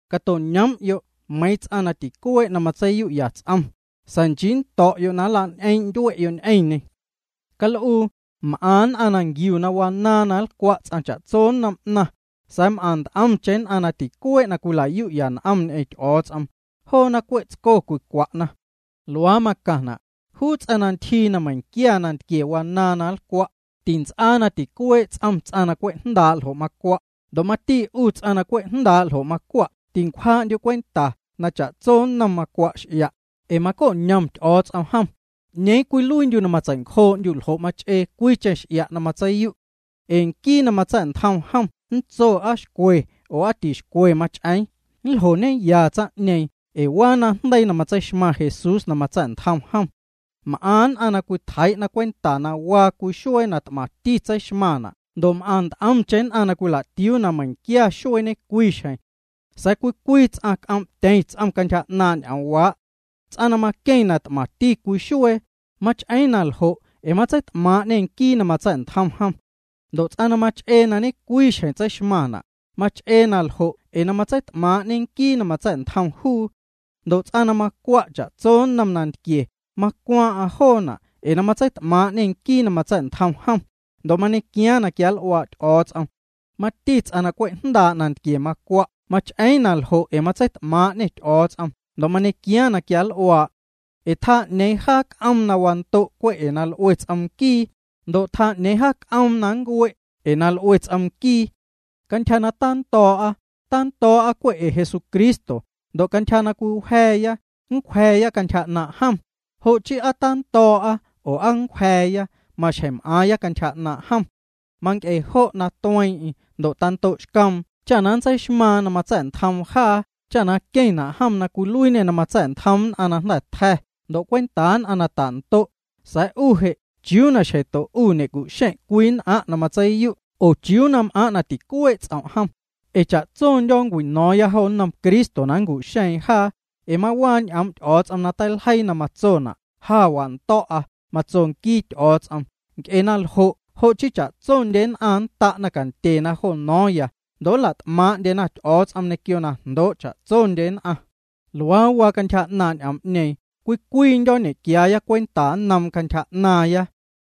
Cato'ñoom'yo' meiiⁿ ts'aⁿ na ticuee' na matseiyu'ya ts'om, sa̱a̱ nchii na nnto̱'yo' na nla'ñ'eeⁿ'ndyue'yo' ñ'eⁿñê. Cal'uu, m'aⁿ nn'aⁿ nquiu na wanaaⁿ na nlcwa' ts'aⁿ cha'tso nnom 'naⁿ, sa̱a̱ m'aⁿ nt'omcheⁿ na ticuee' na cwilayu'ya n'om ñ'eⁿ Ty'o̱o̱ts'om, joona cwe' tsco cwicwa'na. Luaa macaⁿna': Juu ts'aⁿ na ntyjii na meiⁿquia nantquie wanaaⁿ na nlcwa', tints'aa na ticuee' ts'om ts'aⁿ na cwe' jndaa' ljo' macwa'. Ndo' mati 'u ts'aⁿ na cwe' jndaa' ljo' macwa' tincwjaa'ndyu' cwenta cwe' na cha'tso nnom macwa' x'ia', ee maco'ñom Ty'o̱o̱ts'om jom. ¿'Ñeeⁿ cwiluiindyu' na matsei'ncjoo'ndyu' ljo' mach'ee cwiicheⁿ x'ia' na matseiyu'? Ee nquii na matsa̱'ntjom jom nntso na aa xcwe aa tixcwe mach'eeⁿ. Nljoñeya tsaⁿ'ñeeⁿ ee waa najndeii na matseixmaⁿ Jesús na matsa̱'ntjom jom. M'aⁿ nn'aⁿ na cwitjeii'na cwenta na waa cwii xuee na t'maⁿti tseixmaⁿna' ndo' m'aⁿ nt'omcheⁿ nn'aⁿ na cwila'tiuu na meiⁿnquia xuee ñecwii xjeⁿ. Sa̱a̱ cwii cwii ts'aⁿ c'oom'tyeⁿ ts'om cantyja 'naaⁿ' ñ'oom'waa'. Ts'aⁿ na maqueⁿ na t'maⁿti cwii xuee, mach'eeⁿ na ljo' ee na matseit'maaⁿ'ñê Nquii na matsa̱'ntjom jom. Ndo' ts'aⁿ na mach'ee na ñe'cwii xjeⁿ tseixmaⁿna', mach'ee na ljo' ee na matseit'maaⁿ'ñe Nquii na matsa̱'ntjom juu. Ndo' ts'aⁿ na macwa' cha'tso nnom nantquie, macwaaⁿ'aⁿ joona' ee na matseit'maaⁿ'ñê Nquii na matsa̱'ntjom jom, ndo' mañequiaaⁿ na quianl'uaa' Ty'o̱o̱ts'om. Mati ts'aⁿ na cwe' jndaa' nantquie na macwa' mach'eeⁿ na ljo' ee na matseit'maaⁿ'ñê Ty'o̱o̱ts'om ndo' mañequiaaⁿ na quianl'uaa'. Ee tjaa 'ñeeⁿ jaa c'oom na wando' cwe' ee na l'ue ts'om nquii, ndo' tjaa 'ñeeⁿ jaa c'oom na nncue' ee na l'ue ts'om nquii. Cantyja na tando̱o̱'a, tando̱o̱'a cwe' ee Jesucristo, ndo' cantyja na cwiwja̱a̱ya, ncwja̱a̱ya cantyja 'naaⁿ' jom. Jo' chii aa na tando̱o̱'a oo aa na nncwja̱a̱ya, maxjeⁿ m'aaⁿya cantyja 'naaⁿ' jom. Manc'e jo' na tueeⁿ'eⁿ ndo' tando'xcoom cha na nntseixmaaⁿ na matsa̱'ntjoom jaa cha queⁿna' jom na cwiluiiñê na matsa̱'ntjoom nn'aⁿ na jnda̱ tja̱ ndo' cwentaa nn'aⁿ na ta'ndo'. Sa̱a̱ 'u je', ¿chiuu na xjeⁿto 'u ñe'cu'xeⁿ' cwii nn'aⁿ' na matseiyu' oo chiuu na m'aaⁿ' na ticuee' ts'om' jom? Ee cha'tsondyo̱ nncwino̱o̱ⁿ jo nnom Cristo na nncu'xeeⁿ jaa. Ee mawaa ñ'oom' Ty'o̱o̱ts'om na teiljeii na matsona': Ja wando̱'a, matso nquii Ty'o̱o̱ts'om, nc'e naljo' jo' chii cha'tsondye nn'aⁿ nnta'na cantyena jo no̱o̱ⁿya, ndo' nla't'maaⁿ'ndyena Ty'o̱o̱ts'om ñequio na jndoo' cha'tsondye nn'aⁿ. Luaa waa cantyja 'naaⁿ' ñ'oom'ñeeⁿ, cwii cwiindyo̱ nñequiaaya cwenta nnoom cantyja 'naaⁿya.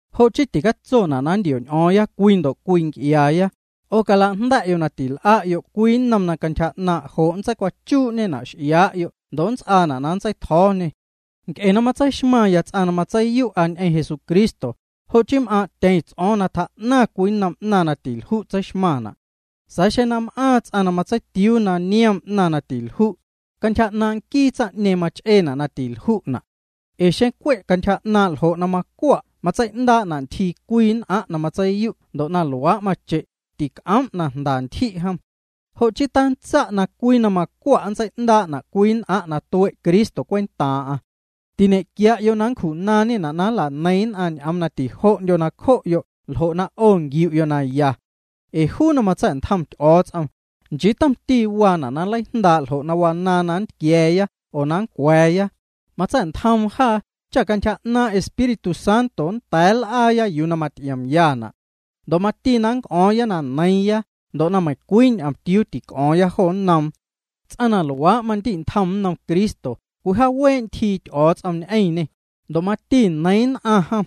Jo' chii tacatsona' na nntio̱'ñ'o̱o̱ⁿya cwii ndo' cwii nc'iaaya. 'O cala'jnda̱'yo' na til'a'yo' cwii nnom na jnaaⁿ' jo' nntseicwachuu'ñena' juu ndo' nnts'aana' na nntseitjo̱o̱ñe. Nc'e na matseixmaⁿya ts'aⁿ na matseiyu'a ñ'eⁿ Jesucristo, jo' chii m'aaⁿ'tyeⁿ ts'o̱o̱ⁿ na tjaa'naⁿ cwii nnom 'naⁿ na tilju' matseixmaⁿna'. Sa̱a̱ xeⁿ na m'aaⁿ ts'aⁿ na matseitiuu na niom 'naⁿ na tilju', cantyja 'naaⁿ' nquii tsaⁿ'ñeeⁿ mach'eena' na tilju'na'. Ee xeⁿ cwe' cantyja 'naaⁿ' ljo' na macwa' matsei'ndaa'na' ntyjii cwii nn'aⁿ' na matseiyu' ndo' na luaa' mache', tic'oom' na jnda ntyji' jom. Jo' chii tantsa' cwii na ya ntyji' macwa' nntsei'ndaa'na' cwii nn'aⁿ' na tue' Cristo cwentaaⁿ'aⁿ. Tiñe'quia'yo' na nncju'naaⁿñena' na nlaneiⁿ nn'aⁿ ñ'oom na tijo'ndyo nacjo'yo' ljo' na 'o nquiu'yo' na ya. Ee juu na matsa̱'ntjom Ty'o̱o̱ts'om, nchii tomti waana' na nleijndaa' ljo' na wanaaⁿ na nntquia̱a̱ya oo na nncwa̱a̱ya. Matsa̱'ntjoom jaa cha cantyja 'naaⁿ' Espíritu Santo nnda̱a̱ nl'aaya yuu na maty'iomyana'. Ndo' mati na nnc'o̱o̱ⁿya na neiiⁿya ndo' na meiⁿcwii ñomtiuu tic'o̱o̱ⁿya jo nnoom. Ts'aⁿ na luaa' mandi'ntjom nnom Cristo, cwijaawee' ntyjii Ty'o̱o̱ts'om ñ'eⁿñê, ndo' mati neiiⁿ nn'aⁿ jom.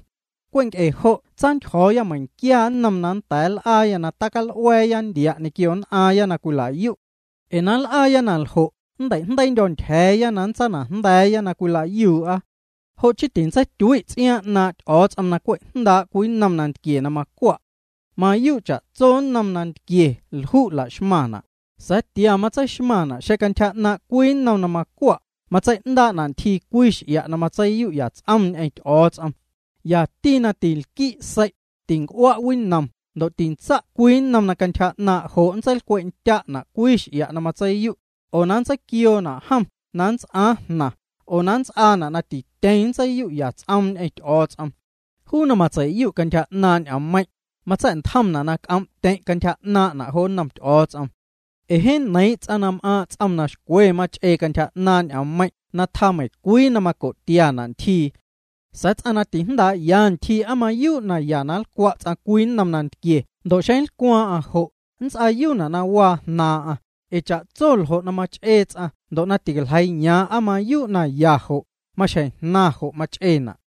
Cwe' nc'e jo' tsantyjo̱o̱ya meiⁿnquia nnom na nnda̱a̱ nl'aaya na tical'ua̱a̱ ndia' ñequio nn'aaⁿya na cwila'yu'. Ee na nl'aaya na ljo' nnteijndeiindyo̱ ntyja̱a̱ na nntsanajnda̱a̱ya na cwila'yuu'a. Jo' chii tintseityui' ts'iaaⁿ 'naaⁿ' Ty'o̱o̱ts'om na cwe' jndaa' cwii nnom nantquie na macwa'. Mayuu' cha'tso nnom nantquie lju' la'xmaⁿna', sa̱a̱ tia matseixmaⁿ' xeⁿ cantyja 'naaⁿ' cwii nnom na macwa' matsei'ndaa'na' ntyjii cwii x'ia' na matseiyu'ya ts'oom ñ'eⁿ Ty'o̱o̱ts'om. Yati na tinlqui' sei', tinc'ua' winom ndo' tintsa' cwii nnom na cantyja 'naaⁿ' jo' nntseilcwe'tya'na' cwii x'ia' na matseiyu', oo na nntseiquioona' jom na nnts'aaⁿ jnaⁿ oo na nnts'aana' na tityeⁿ matseiyu'ya ts'oom ñ'eⁿ Ty'o̱o̱ts'om. Juu na matsei'yu' cantyja 'naaⁿ' ñ'oommeiⁿ', matsa̱'ntjomna' na c'oom'tyeⁿ' cantyja 'naaⁿ'na' jo nnom Ty'o̱o̱ts'om. Ee jeeⁿ neiiⁿ' ts'aⁿ na m'aaⁿ' ts'om na xcwe mach'ee cantyja 'naaⁿ' ñ'oommeiⁿ' na tjaa meiiⁿcwii na maco'tia'na' ntyjii. Sa̱a̱ ts'aⁿ na tijndaa'ya ntyjii aa mayuu' na ya na nlcwa' ts'aⁿ cwii nnom nantquie ndo' xeⁿ nlcwaaⁿ'aⁿ jo', nnts'aayuuna' jnaaⁿ'aⁿ waa, ee cha'tso ljo' na mach'ee ts'aⁿ ndo' ticaljeiiyaaⁿ aa mayuu' na ya jo', maxjeⁿ jnaⁿ jo' mach'eena'.